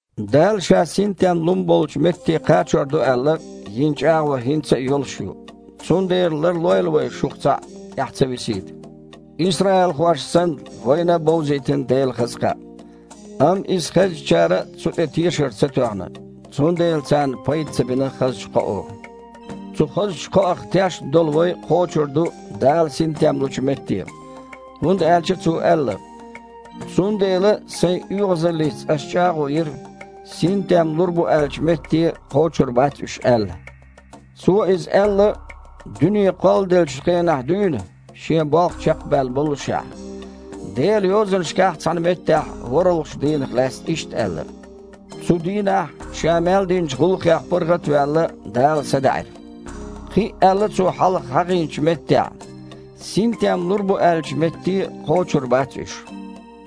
Дала, Ша синтем лун болчу метте кхачор ду аьлла, йина чІагІо хІинца а йолуш ю, цундела ларлойла вай шух цхьаъ тІаьхьа ца висийта. Исраилхошна санна, вайна а бовзийтина Делан хаза кхаъ. Амма иза хезначара цу тІе тешар ца тоьхна, цундела царна пайда ца бина хазачу кхоо. Цу хазачу кхоах тешна долу вай кхочур ду Дала синтем лучу метте, хІунда аьлча Цо аьлла: «Цундела Сайн оьгІазаллица Ас чІагІо йира, синтем лур бу аьллачу метте кхочур бац уьш аьлла». Цо иза аьлла, дуьне кхолладеллачу хенахь дуьйна Шен болх чекхбаьлла боллушехь. Делан Йозанашкахь цхьана меттехь ворхІалгІачу дийнах лаьцна иштта аьлла: «Цу дийнахь, Ша мел динчу гІуллакхех паргІат а ваьлла, Дала садаьІира». Кхин а аьлла Цо хьалха хьахийначу меттехь: «Синтем лур бу аьллачу метте кхочур бац уьш».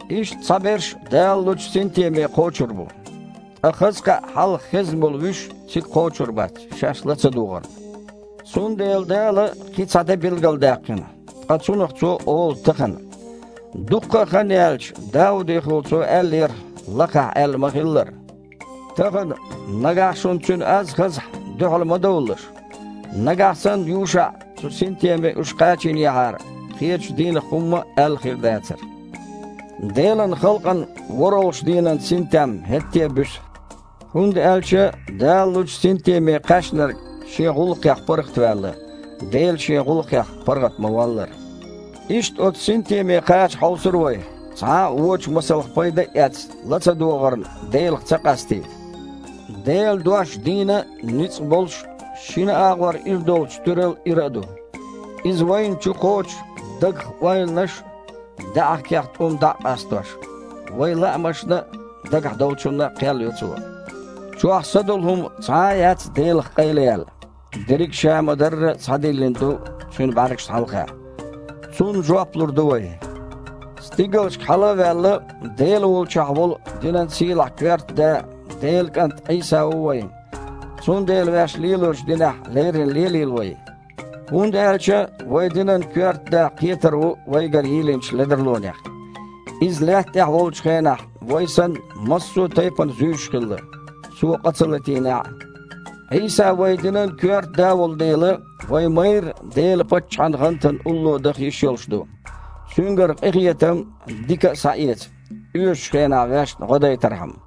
Иштта, цхьаберш Дала лучу синтеме кхочур бу, ткъа хаза кхаъ хьалха хезна болу вуьш цига кхочур бац, шаьш ла ца догІарна. Цундела Дала кхин цхьа де билгалдаьккхина, ткъа цунах Цо олу «тахана». Дуккха а хан яьлча, Даудехула Цо аьллера, лакхахь аьлла ма-хиллара: «Тахана, нагахь шуна Цуьнан аз хазахь, дуьхьал ма довлалаш». Нагахь санна ЮшаІа цу синтеме уьш кхачийнехьара, кхечу дийнах хІумма а аьлла хир дацара. Делан халкъана ворхІалгІачу дийнан синтем хІетте а буьсу. ХІунда аьлча Дала лучу синтеме кхаьчнарг шен гІуллакхех паргІатваьлла, Дела Шен гІуллакхех паргІат ма-валлара. Иштта оцу синтеме кхача хьовсур вай, цхьа а, вочу масалх пайда а эцна, ла ца догІарна Делах ца къастийта. Делан дош дийна а, ницкъ болуш а, шина агІор ира долчу туьрал ира а ду. Иза вайна чукхочу, дагах ойланаш а, даьІахкех тІум а дІа а къастош. Вайн лаамашна а, дагахь долчунна а кхел йо цо. Чохь са долу хІума цхьа а яц Делах къайлаяьлла, дерриг а ша ма-дарра схьадиллина ду Цуьнан бІаьргашна хьалха. Цунна жоп лур ду вай. Стигалшка хьала а ваьлла, Дела волчохь волу динан сийлахь коьрта Да, Делан КІант Іийса ву вайн, цундела ваьш лелочу динехь леррина лелийла вай. ХІунда аьлча вайн динан коьрта Да кхетар ву вайгара йийлинчу ледарлонех: Иза лаьтта тІехь волчу хенахь, вай санна, массо а тайпана зуьйш хилла, Цо къа ца латийнехь а. Іийса вайн динан коьрта Да волу дела, вай майрра Делан паччахьан гІантана улло даха йиш йолуш ду, Цуьнгара къинхетам а, дика а схьаэца, оьшучу хенахь ваьшна гІо дайтархьама.